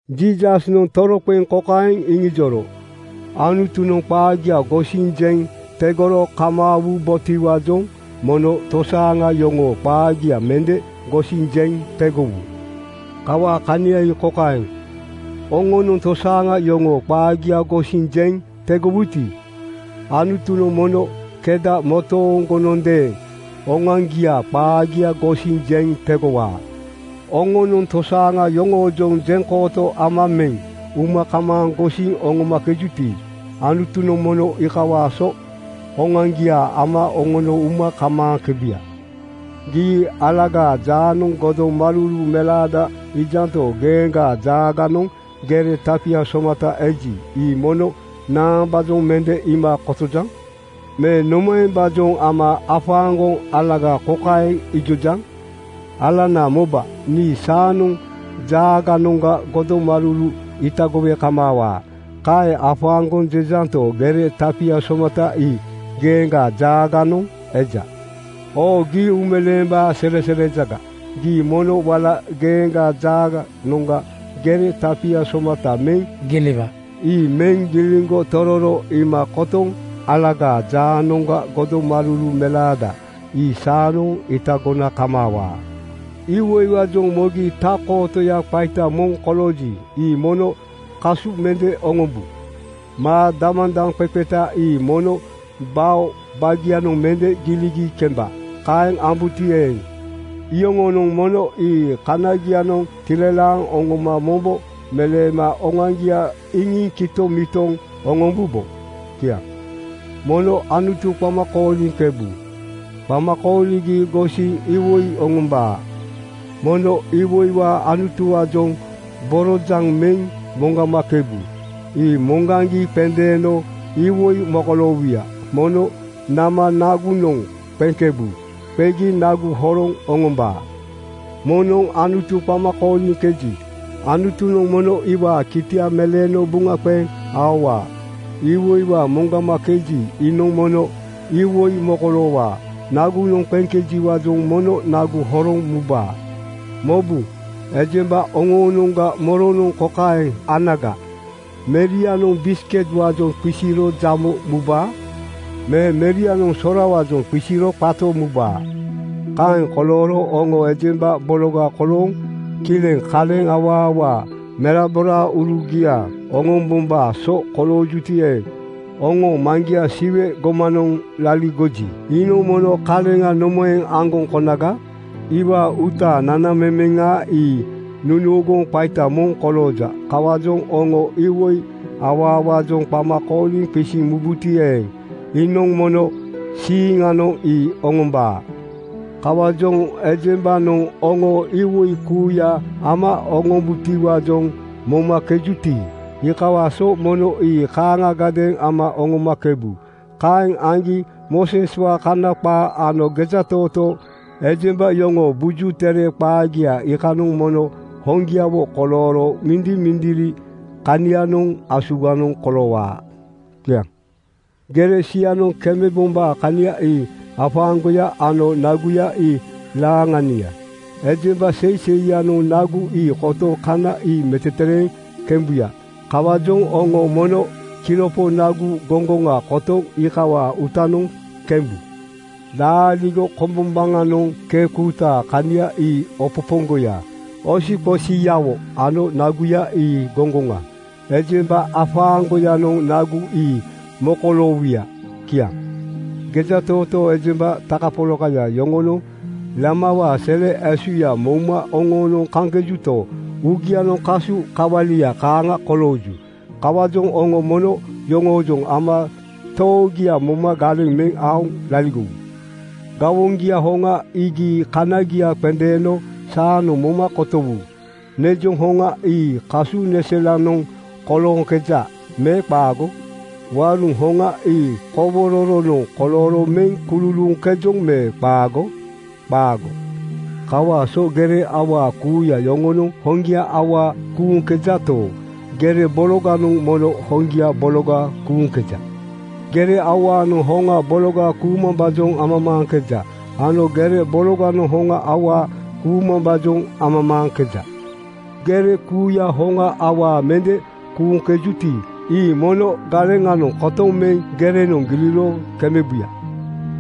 Jiisasnoŋ toroqeŋ kokaeŋ iŋijoro, “Anutunoŋ qaagia gosiŋ jeŋ tegoro kamaawubotiwaajoŋ mono tosaaŋa yoŋoo qaagia mende gosiŋ jeŋ tegowu. Kawaa kania ii kokaeŋ: Oŋonoŋ tosaaŋa yoŋoo qaagia gosiŋ jeŋ tegowuti, Anutunoŋ mono keda motooŋgonondeeŋ oŋoaŋgiaa qaagia gosiŋ jeŋ tegowaa. Oŋonoŋ tosaaŋa yoŋoojoŋ jeŋkooto ama meŋ uma kamaaŋ gosiŋ oŋomakejuti, Anutunoŋ mono iikawaa so oŋoaŋgia ama oŋono uma kamaaŋkebuya. “Gii alagaa jaanoŋ godomaruru melaada iijanto, geeŋgaa jaaganoŋ gere tapia somata eji, ii mono naambaajoŋ mende iima kotojaŋ? Me nomaembaajoŋ ama afaaŋgoŋ alaga kokaeŋ ijojaŋ, ‘Alana moba, nii saanoŋ jaaganoŋga godomaruru itagowe kamaawa?’ Kaeŋ afaaŋgoŋ jejanto, gere tapia somata ii geeŋgaa jaaganoŋ eja. “Oo gii uumeleembaa selesele ejaga, gii mono wala geeŋgaa jaaganoŋga gere tapia somata meŋ giliwa. Ii meŋ giliŋgo tororo iima kotoŋ alagaa jaanoŋga godomaruru melaada ii saanoŋ itagona kamaawaa. Iwoiwaajoŋ mogi tak-kootoya qaita moŋ kolooji, ii mono kasu mende oŋombu. Maa damandaŋ qeqeta ii mono bao bagianoŋ mende giligi kemba. Kaeŋ ambuti eeŋ, iyoŋonoŋ mono ii kanagianoŋ tilalaaŋ oŋoma mombo meleema oŋoaŋgia iŋiŋ kitomitoŋ oŋombubo. Kiaŋ. “Mono Anutu qama kooliŋkebu. Qama kooligi gosiŋ iwoi oŋombaa. Mono iwoiwaa Anutuwaanoŋ borojaŋ meŋ moŋgamakebu. Ii moŋgaŋgi qendeeno iwoi mokoloowuya. Mono nama nagunoŋ qeŋkebu. Qegi nagu horoŋ oŋombaa. Moŋnoŋ Anutu qama kooliŋkeji, Anutunoŋ mono iwaa kitia meleeno buŋa qeŋ aowaa. Iwoiwaa moŋgamakeji, iinoŋ mono iwoi mokoloowaa. Nagunoŋ qeŋkejiwaajoŋ mono nagu horoŋ mubaa. “Mobu, ejemba oŋoonoŋga moronoŋ kokaeŋ anaga: Merianoŋ bisketwaajoŋ qisiro jamo mubaa? Me merianoŋ sorawaajoŋ qisiro qato mubaa? “Kaeŋ kolooro oŋo ejemba bologa kolooŋ kileŋ kaleŋ awaa awaa meraboraurugia oŋombombaa so koloojuti eeŋ, oŋoo Maŋgia Siwe gomanoŋ laligoji, iinoŋ mono kaleŋa nomaeŋ aŋgoŋ konaga? Iwaa uutaa nanamemeŋa ii nunuuguŋ qaita moŋ kolooja. Kawaajoŋ oŋo iwoi awaawaajoŋ qama kooliŋ qisiŋ mubuti eeŋ, iinoŋ mono siiŋanoŋ ii oŋombaa. “Kawaajoŋ ejembanoŋ oŋo iwoi kuuya ama oŋombutiwaajoŋ momakejuti, iikawaa so mono ii kaaŋagadeeŋ ama oŋomakebu. Kaeŋ aŋgi Mooseswaa Kana qaa ano gejatootoo ejemba yoŋoo Buju Tere qaagia iikanoŋ mono hoŋgiawo kolooro mindimindiri kanianoŋ asuganoŋ koloowaa. Kiaŋ. “Gere sianoŋ kemebombaa kania ii afaaŋgoya ano naguya ii laaŋania. Ejemba seiseiyanoŋ nagu ii kotoŋ kana ii metetereeŋ kembuya. Kawaajoŋ oŋo mono kiropo nagu goŋgoŋa kotoŋ iikawaa uutanoŋ kembu. “Laaligo kombombaŋanoŋ keukeutaa kania ii opopoŋgoya osiqosiawo ano naguya ii goŋgoŋa. Ejemba afaaŋgoyanoŋ nagu ii mokoloowuya. Kiaŋ. “Gejatootoo ejemba takapolakaya yoŋonoŋ lamawaa sele esuya mouma oŋoonoŋ kaŋkejuto, uugianoŋ kasu kawalia kaaŋa kolooju. Kawaajoŋ oŋo mono yoŋoojoŋ ama toogia moma galeŋ meŋ aoŋ laligowu. Gawoŋgiaa hoŋa iigi kanagia qendeeno saanoŋ moma kotowu. Nejoŋ hoŋa ii kasuneselanoŋ kolooŋkeja me qaago? Waruŋ hoŋa ii kowororonoŋ kolooro meŋ kululuuŋkejoŋ me qaago? Qaago! “Kawaa so gere awaa kuuya yoŋonoŋ hoŋgia awaa kuuŋkejato, gere bologanoŋ mono hoŋgia bologa kuuŋkeja. Gere awaanoŋ hoŋa bologa kuumambaajoŋ amamaaŋkeja ano gere bologanoŋ hoŋa awaa kuumambaajoŋ amamaaŋkeja. “Gere kuuya hoŋa awaa mende kuuŋkejuti, ii mono galeŋanoŋ kotoŋ meŋ gerenoŋ giliro kemebuya.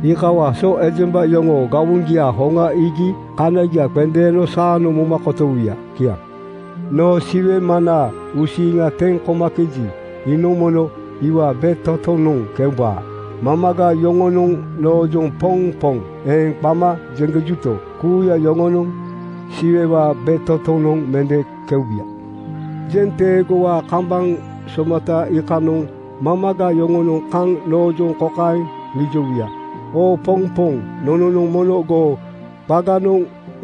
Iikawaa so ejemba yoŋoo gawoŋgiaa hoŋa iigi kanagia qendeeno saanoŋ moma kotowuya. Kiaŋ. “Noo Siwe maŋnaa uusiiŋa teŋ komakeji, iinoŋ mono iwaa bentotonoŋ keubaa. Mamaga yoŋonoŋ noojoŋ ‘Poŋ, Poŋ!’ eeŋ qama jeŋkejuto, kuuya yoŋonoŋ Siwewaa bentotonoŋ mende keubuya. “Jenteegowaa kambaŋ somata iikanoŋ mamaga yoŋonoŋ kaŋ noojoŋ kokaeŋ nijowuya, ‘Oo Poŋ Poŋ, nononoŋ mono goo qaganoŋ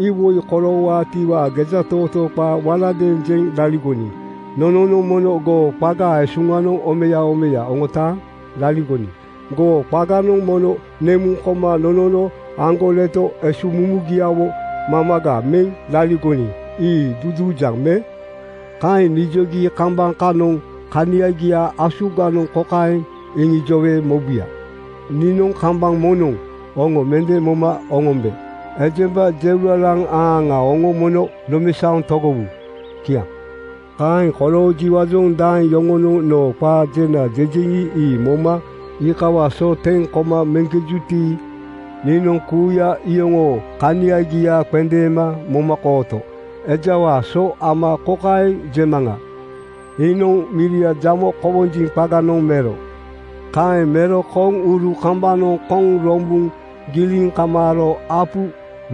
iwoi koloowaatiwaa gejatootoo qaa waladeeŋ jeŋ laligoniŋ. Nononoŋ mono goo qagaa esuŋanoŋ omeya omeya oŋotaaŋ laligoniŋ. Goo qaganoŋ mono nemuŋ koma nonono aŋgoleto esuŋmumugiawo mamaga meŋ laligoniŋ. Ii duduujaŋ me?’ Kaeŋ nijogi kambaŋ kanoŋ kaniagia asuganoŋ kokaeŋ iŋijowe mobuya, ‘Niinoŋ kambaŋ moŋnoŋ oŋo mende moma oŋombe. Ejemba jeulalaŋ aaŋa, oŋo mono nomesaoŋ togowu.’ Kiaŋ. “Kaeŋ koloojiwaajoŋ daeŋ yoŋonoŋ noo qaa jena jejeŋi, ii moma iikawaa so teŋ koma meŋkejuti, niinoŋ kuuya iyoŋoo kaniagia qendeema momakooto ejawaa so ama kokaeŋ jemaŋa: Iinoŋ miria jamo kowonjiŋ qaganoŋ mero. Kaeŋ mero koŋuru kambanoŋ koŋ rombuŋ giliŋ kamaaro apu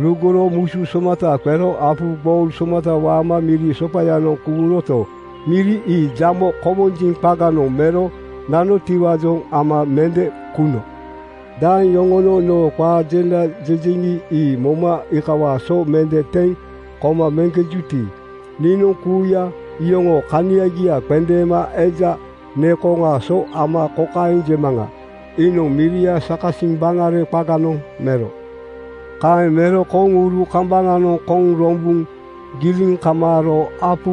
luguro musu somata qero apu gboulu somata waama miri sopayanoŋ kuuroto, miri ii jamo kowonjiŋ qaganoŋ mero nanotiwaajoŋ ama mende kuno. “Daeŋ yoŋonoŋ noo qaa jena jejeŋi, ii moma iikawaa so mende teŋ koma meŋkejuti, niinoŋ kuuya iyoŋoo kaniagia qendeema eja nekoŋaa so ama kokaeŋ jemaŋa: Iinoŋ miria sakasiŋ baŋare qaganoŋ mero. Kaeŋ mero koŋuru kambanoŋ koŋ rombuŋ giliŋ kamaaro apu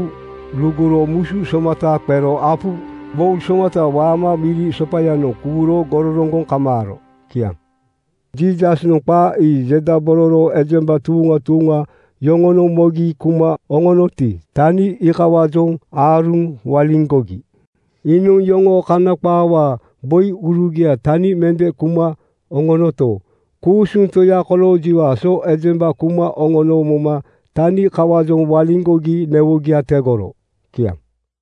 luguro musu somata qero apu gboulu somata waama miri sopayanoŋ kuuro gororoŋgoŋ kamaaro.” Kiaŋ. Jiisasnoŋ qaa ii jedabororo ejemba tuuŋa tuuŋa yoŋonoŋ mogi kuma oŋonoti, tani iikawaajoŋ aaruŋ waliŋgogi. Iinoŋ yoŋoo Kana qaawaa boiurugiaa tani mende kuma oŋonoto, ku-usuŋ Toya koloojiwaa so ejemba kuma oŋono moma tani kawaajoŋ waliŋgogi newogia tegoro. Kiaŋ.